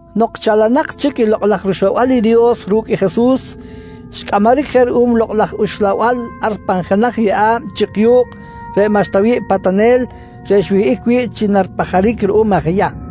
Nok chalanak chic i Lokꞌ laj rUxlabal i Dios ru̱cꞌ i Jesus, xcꞌamaric je ruꞌum i Lokꞌ laj Uxlabal ar pan jenaj yeꞌa̱b chik yu̱kꞌ reꞌ maꞌxta wi̱ꞌ patanel reꞌ xwihꞌic wi̱ꞌ chi naripajaric ruꞌum aj Yahm.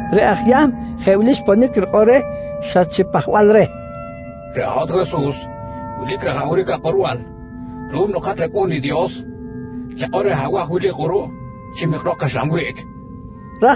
reꞌ aj Yahm jeꞌ wili xponic rikꞌor reh xa chi pajbal reh: «Reꞌ hat Jesus wilic rajawric akꞌorbal ruꞌum nok hat rAcꞌu̱n i Dios. Chakꞌor reh abaj wili kꞌuruꞌ chi mikrok caxlan wiꞌc, nqui reh.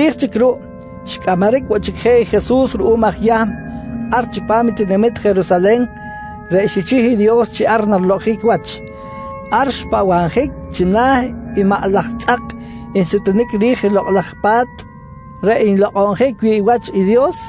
Chiri̱j chic ruꞌ xcꞌamaric woꞌ chic je Jesus ruꞌum aj Yahm ar chipam tinamit Jerusalen reꞌ xichih i Dios chi ar narilokꞌonjic wach. Ar xpahbabjic china̱ i maꞌ laj tzꞌak nsutunic ri̱j i Lokꞌ laj Pa̱t reꞌ nlokꞌonjic wi̱ꞌ wach i Dios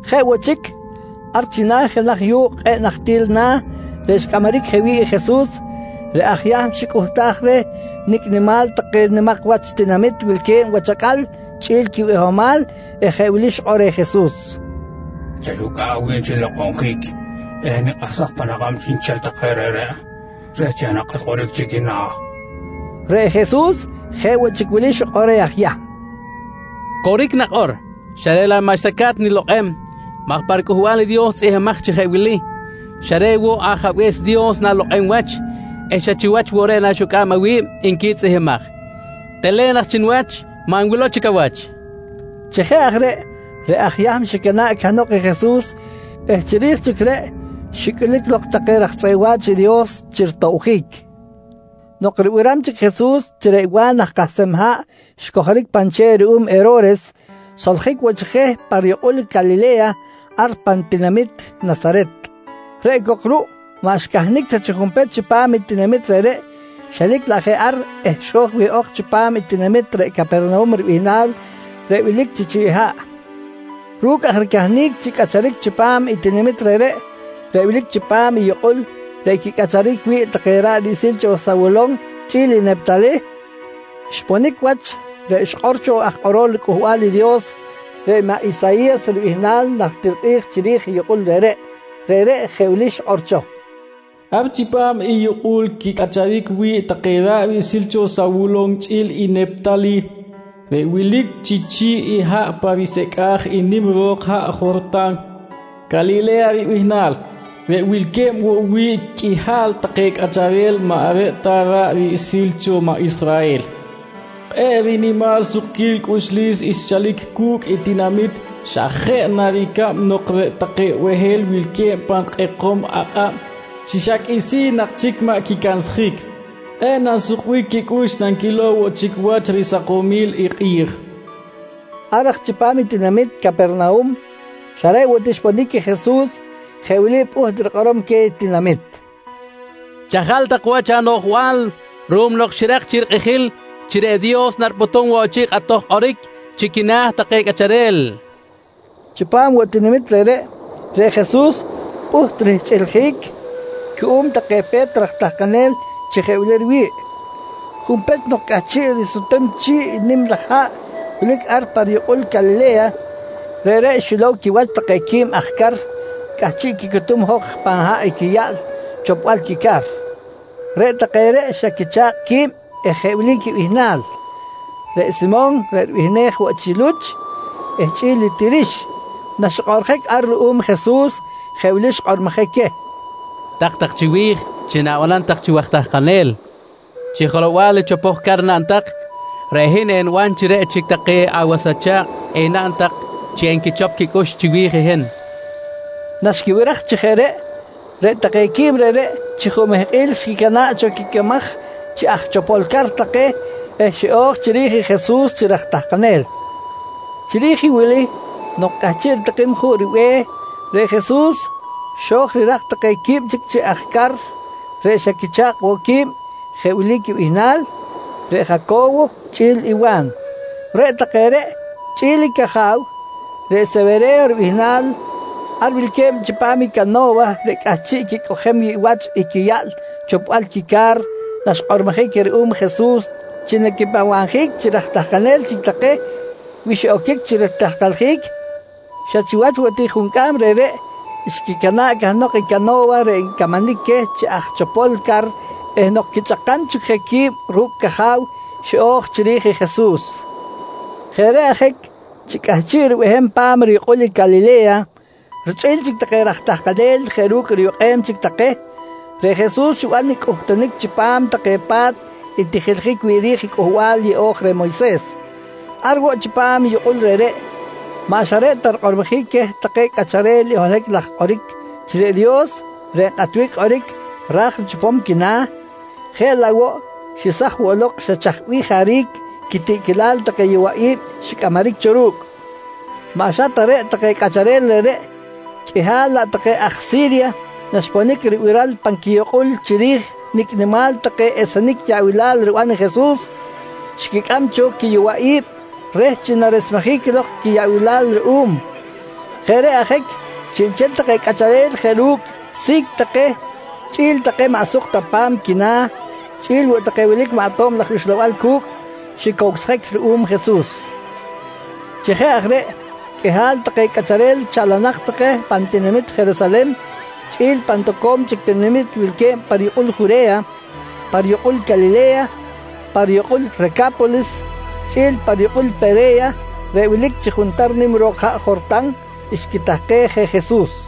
Jeꞌ woꞌ chic, ar china̱ i jenaj yu̱kꞌ kꞌe̱ꞌ nahtil na̱ reꞌ xcꞌamaric je wi̱ꞌ i Jesus, reꞌ aj Yahm xicꞌuhtaj reh nicꞌ nimal take nimak wach tinamit wilque̱b wach acꞌal chꞌi̱l quibihomal eh jeꞌ wili xikꞌor reh Jesus: «Chaxucꞌa̱ꞌ awi̱b chi nilokꞌonjic eh enikꞌahsaj pan akꞌab chiꞌnchel take reꞌreꞌ reh chi enakꞌat kꞌoric chi quina̱, nqui xikꞌor reh. Reꞌ Jesus jeꞌ woꞌ chic wili xikꞌor reh aj Yahm: «Coric nakꞌor, xa reꞌ laꞌ maꞌxta ca̱t nilokꞌem maj pa riCꞌuhbal i Dios tzꞌihmbimaj chi jeꞌ wili: “Xa reꞌ woꞌ Ajabe̱s Dios na̱lokꞌem wach eh xa chiwach woꞌ reꞌ naxucꞌa̱b awi̱b, nqui tzꞌihmbimaj. «Telen aj chi niwach, maꞌ nwilow chic awach, nqui reh. Chi jeꞌ aj reꞌ, reꞌ aj Yahm xicana̱ꞌ cahnok i Jesus eh chiri̱j chic reꞌ xicꞌulic lok take raj tzꞌeꞌ wa̱ch i Dios chi ritobjic. Nok ribiram chic Jesus chi reꞌ Wa̱n aj kahsem haꞌ xcojoric pan che̱ꞌ ruꞌum Hero̱res, xsoljic woꞌ chic je pa riyukꞌul Calile̱ya, ar pan tinamit Nasaret, reꞌ cok ruꞌ maꞌ xcahnic ta chi junpech chipam i tinamit reꞌreꞌ xelic laꞌ je ar eh xo̱j wihꞌok chipam i tinamit reꞌ Capernahum ribihnal reꞌ wilic chi chi̱ꞌ haꞌ. Ru̱cꞌ aj ricahnic chi cꞌacharic chipam i tinamit reꞌreꞌ, reꞌ wilic chipam i yukꞌul reꞌ quicꞌacharic wi̱ꞌ take ra̱ꞌ riꞌsil cho Sawulon chꞌi̱l i Neptalih, xponic wach reꞌ xikꞌor cho i aj kꞌorol riCꞌuhbal i Dios, reꞌ maꞌ Isayi̱yas ribihnal, najtir kꞌi̱j chiri̱j i yukꞌul reꞌreꞌ. Reꞌreꞌ jeꞌ wili xikꞌor cho: “Ar chipam i yukꞌul quicꞌacharic wi̱ꞌ take ra̱ꞌ riꞌsil cho Sawulon chꞌi̱l i Neptalih, reꞌ wilic chi chi̱ꞌ haꞌ pa risecꞌa̱j i nim ro̱k haꞌ Jortan, Calile̱ya ribihnal, reꞌ wilque̱b woꞌ wi̱ꞌ qꞌuihal take cꞌacharel maꞌ reꞌ ta ra̱ꞌ riꞌsil cho maꞌ Israhel, kꞌe̱ꞌ rinimal sukquil cꞌuxlis xchalic cu̱cꞌ i tinamit xa jeꞌ na ricab nok reꞌ take behel wilque̱b pan kꞌekom akꞌab chi xa qꞌuisi̱n nak chic maꞌ quicansjic, kꞌe̱ꞌ nansukbic quicꞌux nanquilow woꞌ chic wach risakomil i kꞌi̱j, nqui xikꞌor cho. Ar aj chipam i tinamit Capernahum xa reꞌ woꞌ ti xponic i Jesus, jeꞌ wili pꞌuht rikꞌorom queh tinamit: «Chajal tak wach anoꞌjbal ruꞌum nok xirak chic rikꞌijil chi reꞌ Dios naripꞌutum woꞌ chic kꞌatoj kꞌoric chi quina̱ take cꞌacharel, nqui queh. Chipam woꞌ tinamit reꞌreꞌ, reꞌ Jesus pꞌuht rihchꞌiljic cuꞌum take pe̱t raj tahkanel chi jeꞌ wili riwi̱ꞌ: Junpech nok cꞌahchiꞌ risutem chi̱ꞌ i nim laj haꞌ wilic ar pa riyukꞌul Calile̱ya, reꞌreꞌ xilow quiwach take quib aj car cꞌahchiꞌ quicutum jok pan haꞌ i quiyaꞌl chopbal quica̱r. Reꞌ take reꞌ xa quicha̱kꞌ qui̱b eh jeꞌ wili quibihnal: Reꞌ Simon reꞌ ribihnej woꞌ chi Luch eh chꞌi̱l i Tirix. Naxikꞌoꞌrjic ar ruꞌum i Jesus, jeꞌ wili xkꞌormojic queh: «Tak chiwi̱j chi na̱banam tak chi waj tahkanel. Chi jelow-bal i chopoj car naꞌn tak, reꞌ hin eniban chi reꞌ chic take awas acha̱kꞌ enaꞌn tak chi enquichop quicꞌux chiwi̱j i hin, nqui Jesus queh. Naxquibiraj chi jeꞌ reꞌ, reꞌ take quib reꞌreꞌ chi jumehkꞌil xquicana̱ꞌ cho quicamaj chi aj chopol car take eh xiꞌo̱j chiri̱j i Jesus chi raj tahkanel. Chiri̱j i wili nok cꞌahchiꞌ ritikim juꞌ ribe̱h, reꞌ Jesus xo̱j rirak take quib chic chi aj car reꞌ xa quicha̱kꞌ woꞌ qui̱b jeꞌ wili quibihnal: Reꞌ Jaco̱wo chꞌi̱l i Wa̱n. Reꞌ take reꞌ chꞌi̱l i caja̱w, reꞌ Sewere̱yo ribihnal, ar wilque̱b chipam i cano̱wa reꞌ cꞌahchiꞌ quicꞌojem wi̱ꞌ wach i quiyaꞌl chopbal quica̱r naxkꞌormojic queh ruꞌum Jesus chi naquipahbabjic chi raj tahkanel chic take wi xiꞌoquic chi ritahkaljic, xa chiwach woꞌ ti juncꞌam reꞌreꞌ xquicana̱ꞌ cahnok i cano̱wa reꞌ ncamanic queh chi aj chopol car eh nok quichꞌakam chic je qui̱b ru̱cꞌ caja̱w, xiꞌo̱j chiri̱j i Jesus. Jeꞌ reꞌ ajic chi cꞌahchiꞌ ribehem pa̱m riyukꞌul i Calile̱ya richꞌi̱l chic take raj tahkanel jeꞌ ru̱cꞌ riyukꞌem chic take, reꞌ Jesus xiban i cꞌuhtunic chipam take pa̱t ntijiljic wi̱ꞌ ri̱j i Cꞌuhbal Yeꞌo̱j reh Moyses. Ar woꞌ chipam i yukꞌul reꞌreꞌ, maꞌ xa reꞌ ta rikꞌormojic queh take cꞌacharel i holohic laj kꞌoric chi reꞌ Dios reꞌ nkꞌatbic kꞌoric ra̱j richopom quina̱ jeꞌ laꞌ woꞌ xesaj woꞌ lok xa chaj bih jaric quitiꞌquilal take yowaꞌi̱b xicꞌamaric cho ru̱cꞌ. Maꞌ xa ta reꞌ take cꞌacharel reꞌreꞌ, qꞌuihal laꞌ take aj Si̱rya naxponic ribiral pan quiyukꞌul chiri̱j nicꞌ nimal take esenic yaꞌbilal riban Jesus, xquicꞌam cho quiyowaꞌi̱b reh chi naresmejic lok quiyaꞌbilal ruꞌum. Jeꞌ reꞌ ajic, chiꞌnchel take cꞌacharel jeꞌ ru̱cꞌ si̱c take chꞌi̱l take maꞌ suk ta pa̱m quina̱ chꞌi̱l woꞌ take wilic maꞌ tob laj uxlabal cu̱cꞌ, xicowsjic ruꞌum Jesus. Chi jeꞌ aj reꞌ, qꞌuihal take cꞌacharel chalanak take pan tinamit Jerusalen chꞌi̱l pan toco̱m chic tinamit wilque̱b pa riyukꞌul Jure̱ya, pa riyukꞌul Calile̱ya, pa riyukꞌul Reca̱polis chꞌi̱l pa riyukꞌul i Pere̱ya reꞌ wilic chi juntar nim ro̱k haꞌ Jortan, xquitahkej je Jesus.